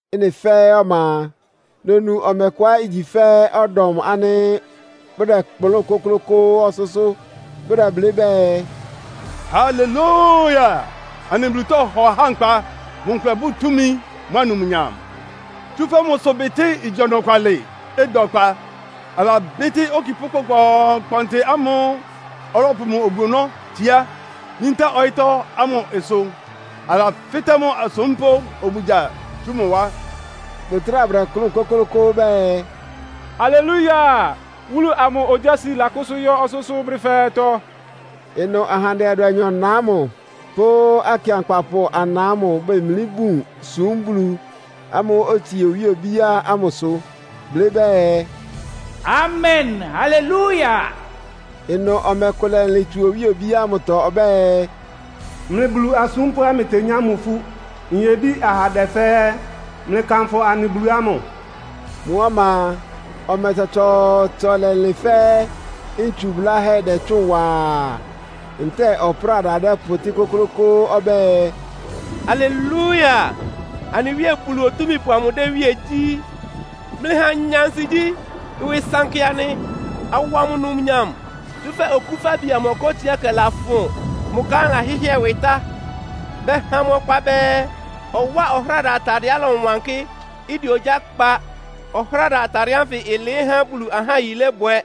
Ɩ́nɩ fɛ́ɛ́ ɔma a, nonu ɔmɛ kʋá igyi fɛ́ ɔdɔm ánɩ́ bʋdɛkplʋ́n kʋklʋ́kʋ́ʋ́ ɔsʋ́sʋ́. Bʋdɛblɩ́ bɛɛ, “Halelúia! Anɩ Bulu tɔhɔ ahá nkpa. Mʋ nkʋlɛ bʋ́ʋ túmi mʋ́a numnyam, tsúfɛ́ mʋ ɩsʋbɩtɩ́ igyi ɔnɔkwalɩ, ɩda ɔkpa. Alabɩ́tɩ́ okipʋ́ kpɔnkpɔɔnkpɔntɩ ámʋ́ʋ́ ɔlɔpʋ mʋ obu-ɔnɔ́ tsiá yíntá ɔyɩ́tɔ́ ámʋ ɩsʋ, alafɩ́tɛ́ mʋ asúmpʋ́ obugya tsú mʋ wá.” Bʋtráa bʋdɛkplʋ́n kʋ́klʋ́kʋ́ʋ́ bɛɛ, “Halelúia! Wúlu amʋ ogyási lakʋ́sʋ́ yɔ́ ɔsʋ́sʋ́ brɛ́ fɛ́ɛ́tɔ́!” Ɩnʋ ahandɛ adʋanyɔ-na ámʋ pʋ́ akɩankpapʋ ana ámʋ bemlí bun súm Bulu ámʋ́ʋ́ otsie owíe obíá ámʋsʋ, blɩ́ bɛɛ, “Amen! Halelúia!” Ɩnʋ ɔmɛ kʋ lɛlɩn tsú owíe obíá ámʋtɔ ɔbɛ́ɛ, “Mlɩ Bulu asúmpʋ́á mlɩtenyá mʋ ifú, nyebí ahandɛ fɛ́ɛ́, mlɩkanfʋ anɩ Bulu ámʋ!” Mʋ́ ɔma a, ɔmɛ tsɔtsɔɔtsɔ lɛlɩn, fɛ́ ntsu bʋ́láhɛ́ dɛ́tsʋ́ʋn waa, ntɛ́ɛ ɔpráda dɛpʋtɩ́ kʋ́klʋ́kʋ́ʋ́ ɔbɛ́ɛ, “Halelúia! Anɩ Wíe Bulu Otúmípʋ amʋ dɛ́ iwíe gyí. Mlɩha anya ansigyí, ɩwɩ ɩsankɩ anɩ, awa mʋ numnyam! Tsúfɛ́ Okúfabi amʋ ɔká otsiákɛ lafʋn. Mʋ ka ámʋ lahɩ́hɩ́ɛ ɩwɩ tá.” Bɛha mʋ ɔkpa bɛɛ, ɔwáa ɔhráda atadɩɛá ɩlɔwankɩ́, ɩdɛ ogyá kpa. (Ɔhráda atadɩɛ ánfɩ ɩlɩɩ́ há Bulu ahá yilébwɛ.)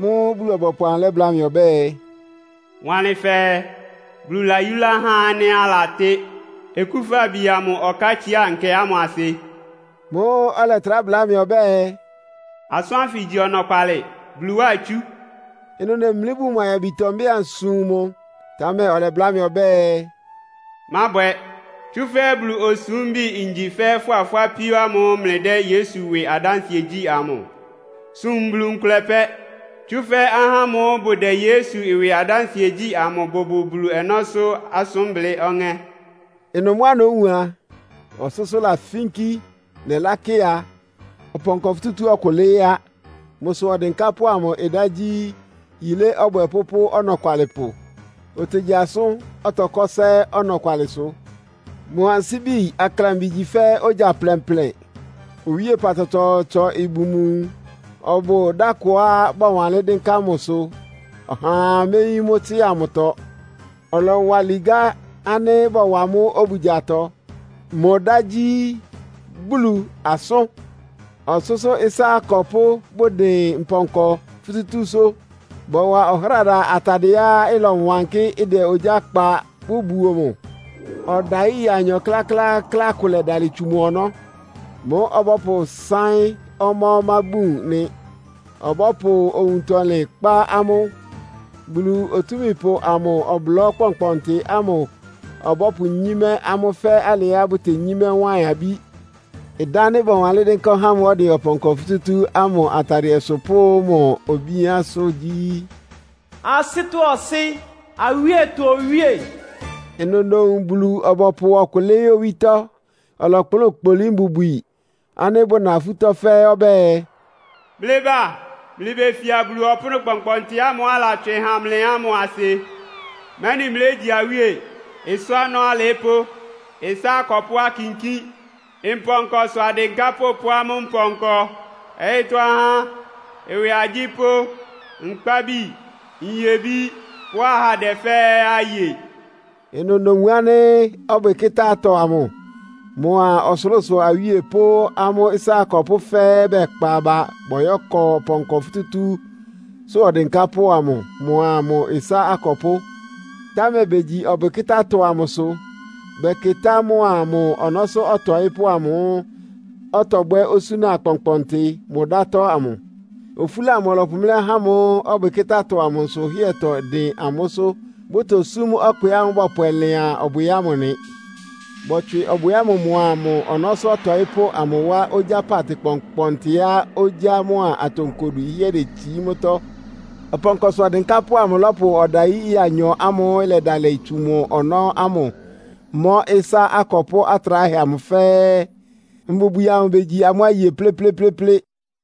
Mʋ́ʋ́ Bulu-ɔbɔpʋ amʋ lɛ́bláa mɩ ɔbɛ́ɛ, “Wanlɩn fɛɛ, ‘Bulu layúlá ahá ánɩ́ alatɩ́ Okúfabi amʋ ɔkátsiá nkɛ ámʋ asɩ.’” Mʋ́ʋ́ ɔlɛtrá bla mɩ ɔbɛ́ɛ, “Asʋ́n ánfɩ igyi ɔnɔkwalɩ, Bulu wá itsú.” Ɩnʋ nemlí bun mʋ ayabitɔ, mbɛ́ɛ ansum mʋ, támɛ ɔlɛbláa mɩ ɔbɛ́ɛ, “Mábwɛ! Tsúfɛ́ Bulu osúmbi ngyi fɛ́ fʋ́a fʋ́ apíó ámʋ́ʋ́ mlɩdɛ́ Yesu ɩwɩ adánsɩɛ gyí amʋ. Sum Bulu nkʋlɛ pɛ́! “Tsúfɛ́ ahá ámʋ́ʋ́ bʋdɛ Yesu ɩwɩ adánsɩɛ gyí amʋ bʋbʋ Bulu ɔnɔ́sʋ́ asʋ́nblɩ́ ɔŋɛ́.” Ɩnʋ mʋ́á nówun a, ɔsʋ́sʋ́ lafínkí. Nɛlákɩ a, ɔpɔnkɔ futútú ɔkʋ lɩ́ɩ́ á! Mʋsʋ ɔdɩnkápʋ́ amʋ ɩdá gyí, “Yilé Ɔbwɛpʋ́ pʋ́ Ɔnɔkwalɩpʋ.” Otegyi asʋ́n, ɔtɔkɔ́ ɩsá ɛ́ ɔnɔkwalɩsʋ. Mʋ ansíbi aklambi igyi fɛ́ ogya plɛnplɛn. Owíepa tsɔtsɔɔtsɔ ibun mʋ nwun. Ɔbʋ dá kʋá bɔwanlɩ́n dɩ́nká mʋsʋ, ɔhaa méyín mʋ́ tsɩ́a mʋtɔ. Ɔlɔwa ligá ánɩ́ bɔwa mʋ́ obugyatɔ. Mʋ ɩdá gyí, “Bulu Asʋ́n.” Ɔsʋ́sʋ́ ɩsá akɔpʋ́ bʋdɩn mpɔnkɔ futútúsʋ́. Bɔwa ɔhráda atadɩɛá ɩlɔwankɩ́, ɩdɛ ogyá kpa bʋbuo mʋ. Ɔdayí ɩya anyɔ kláklááklá kʋ lɛdalɩ tsu mʋ ɔnɔ́. Mʋ́ ɔbɔ́pʋsáɩ́n ɔmá-ɔmá bun nɩ. Ɔbɔ́pʋ owuntɔlɩn kpá amʋ́. Bulu Otúmípʋ amʋ ɔblɔ́ kpɔnkpɔntɩ ámʋ ɔbɔ́pʋnyímɛ́ amʋ́ fɛ́ alɩá bʋtenyímɛ́ wáɩn-abí. Ɩdá ánɩ́ bɔwanlɩ́n dɩ́nká ɔhá ámʋ́ʋ́ ɔdɩn ɔpɔnkɔ futútú ámʋ atadɩɛsʋ pʋ́ mʋ obíánsʋ́ gyí, “Asɩ́tɔ́ Ɔsɩ́, Awíetɔ Owíe.” Ɩnʋ nowun Bulu-ɔbɔpʋ ɔkʋ lɩ́ɩ́ owítɔ́. Ɔlɔkplʋ́n kpolí mbubwi ánɩ́ bʋna afútɔ́ fɛ́ɛ́ ɔbɛ́ɛ, “Mlɩba! Mlɩbefia Bulu ɔpʋ́nʋ́ kpɔnkpɔntɩ ámʋ́ʋ́ alatswɩ ha mlɩ ámʋ asɩ! Mɛ́nɩ mlégyi awíe, ɩsá ɔnɔ́ alɩɩ́pʋ́, ɩsá akɔpʋ́ akinkín, mpɔnkɔsʋ adɩnkápʋ́ pʋ́ amʋ́ mpɔnkɔ, ɔyɩ́tɔ́ ahá, ɩwɩ agyípʋ́, nkpábi, nyebí pʋ́ ahandɛ fɛ́ɛ́ aye.” Ɩnʋ nowun ánɩ́ ɔbwɩkɩ́tá-atɔ amʋ mʋa ɔsʋlʋ́sʋ awíe pʋ́ amʋ́ ɩsá akɔpʋ́ fɛ́ɛ́ bɛkpa aba bɔyɔ́kɔ ɔpɔnkɔ futútúsʋ́ ɔdɩnkápʋ́ amʋ mʋa mʋ ɩsá akɔpʋ́. Támɛ begyi ɔbwɩkɩ́tá-atɔ amʋsʋ, bɛkɩtá mʋa mʋ ɔnɔ́sʋ́ ɔtɔɩ́pʋ́ amʋ́ʋ́ ɔtɔbwɛ́ osúna akpɔnkpɔntɩ mʋ ɩdátɔ́ ámʋ. Ofúla amʋ ɔlɔpʋmlɛ́ ahá ámʋ́ʋ́ ɔbwɩkɩ́tá-atɔ amʋ nsʋhɩ́ɛtɔ dɩn amʋ́sʋ́, bʋtosúm ɔkpɩ ámʋ́ʋ́ bɔpwɛ lɩan ɔbwɩ ámʋ nɩ. Bɔtswɩ ɔbwɩ ámʋ mʋa mʋ ɔnɔ́sʋ́ ɔtɔɩ́pʋ́ amʋ wá ogyá paatɩ kpɔnkpɔntɩá ogyá mʋ́a atonkodu ɩhɩ́ɛ́ detsií mʋ́tɔ́. Ɔpɔnkɔsʋ ɔdɩnkápʋ́ amʋ lɔ́pʋ ɔdayí ɩya anyɔ ámʋ́ʋ́ ɩlɛdalɩ tsu mʋ ɔnɔ́ ámʋ mɔ́ ɩsá akɔpʋ́ atráhɛ amʋ fɛ́ɛ́. Mbubwi amʋ begyi amʋ́ aye plɩ́plɩ́plɩ́plɩ́.